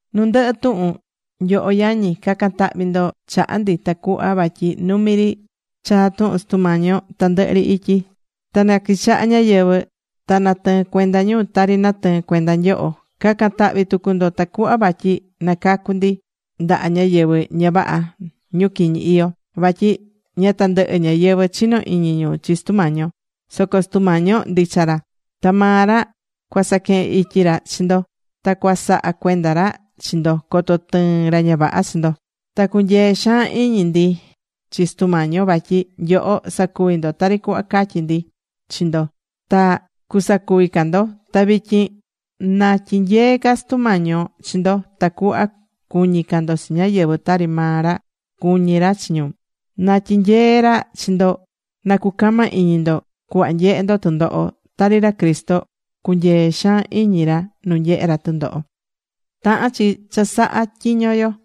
Nu ndɨhɨ tuhun, nyoho yañi, ca̱can tahvi ndo chaha ndi tacuhva vatyi numi ri chaa tuhun Sutu Mañi yo tandɨhɨ ri ityi. Ta na quichaha ñáyɨvɨ ta natɨɨn cuenda ñu tari natɨɨ̱n cuenda nyoho. Ca̱can tahví tucu ndo tacuhva vatyi na cacu ndi ndaha ñáyɨvɨ ña vaha, ñu quiñi iyó. Vatyi ña tandɨhɨ ñáyɨvɨ chinó iñi ñu chi Sutu Mañi yo. Soco Sutu Mañi yo ndicha ra. Ta maa ra cuasaquehen ityi ra chi ndo, ta cuasaha cuenda ra chi ndo coto tɨɨn ra ña vaha chi ndo. Ta cunyeé xaan iñi ndi chi Sutu Mañi yo vatyi nyoho sacuví ndo tari cuhva catyí ndi chi ndo, ta cusacuvi ca ndo. Ta vityin na tyinyee ca Sutu Mañi yo chi ndo tacuhva cuñi ca ndo chi ñáyɨvɨ tari maa ra cuñí ra chi ñu. Na tyinyee ra chi ndo na cucama iñi ndo cuhva nyehe ndo tɨndoho, tari ra Cristo cunyee̱ xaan iñi ra nu nyehe̱ ra tɨndoho.Tahán chi cha saha tyiño yo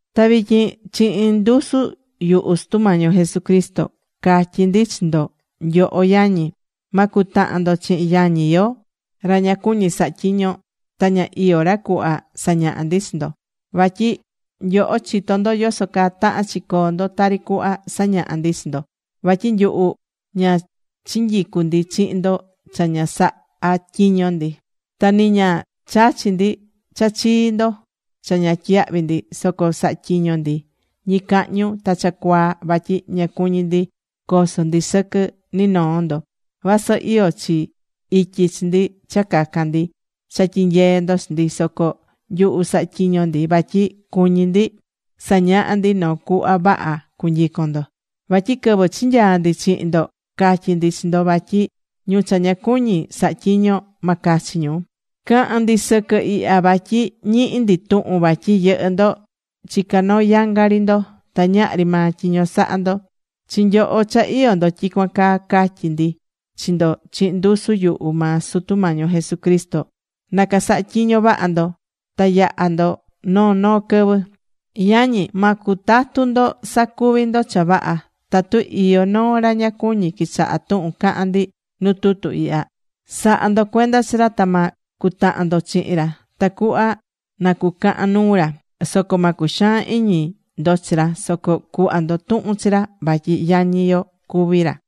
Ta vityin chihin ndusu yuhu Sutu Mañi yo Jesucristo, catyí ndi chi ndo, nyoho yañi, ma cutahan ndo chihin yañi yo ra ña cuñí saha tyiño, ta ña iyó ra cuhva sañaha̱ ndi chi ndo. Vatyi nyoho chitó ndo yoso caa tahán chi coo ndo tari cuhva sañaha̱ ndi chi ndo. Vatyi nyuhu ña chinyicu̱ ndi chihin ndo cha ña sahá tyiño ndi. Ta ni ña chachi̱ ndi cha chii ndo cha ña tyiyahvi̱ ndi. Soco saha̱ tyiño ndi ñicahñu ta cha cuaa vatyi ña cuñí ndi coso ndi sɨquɨ ni noo ndo. Vasɨ iyó chi ityi chi ndi cha cacan ndi cha tyinyee ndo chi ndi, soco nyuhu saha̱ tyiño ndi vatyi cuñí ndi sañaha ndi noo cuhva vaha cunyicon ndo. Vatyi quɨvɨ chinyaa ndi chihin ndo, catyí ndi chi ndo vatyi ñu cha ña cuñí saha tyiño, ma cachi ñu. Cahán ndi sɨquɨ ihya vatyi ñihí ndi tuhun vatyi yɨhɨ́ ndo chicá noo yanga ri ndo ta ñahri maa tyiño sahá ndo. Chi nyoho cha iyó ndo tyicuan caa, catyí ndi chi ndo chihin ndusu yuhu maa Sutu Mañi yo Jesucristo, na casaha tyiño vaha ndo, ta yaha ndo noo noo quɨvɨ. Yañi, ma cutatu ndo sacuvi ndo cha vaha. Tatu iyó noo ra ña cuñí quichaha tuhun cahán ndi nu tutu ihya, sa̱ha ndo cuenda chi ra ta ma cutahan ndo chihin ra tacuhva na cucahan nuu ra. Soco ma cuxaan iñi ndo chi ra, soco cu̱hva ndo tuhun chi ra vatyi yañi yo cuví ra.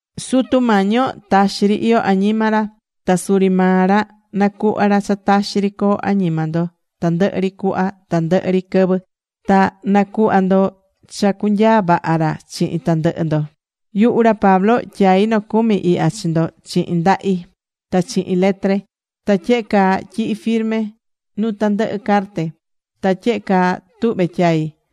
Sutu Mañi yo taxi ri iyó añima ra, ta suri maa ra na cuhva ra cha taxi ri coo añima ndo tandɨhɨ ri cuhva tandɨhɨ ri quɨvɨ. Ta na̱cuhva ndo cha cunyaa vaha ra chihin tandɨhɨ ndo. Yuhu ra Pablo tyaí nocumi ihya chi ndo chihin ndahi, ta chihin letre. Ta tyehe caa tyihí firme nu tandɨhɨ carte. Ta tyehe caa tuhvé tyai.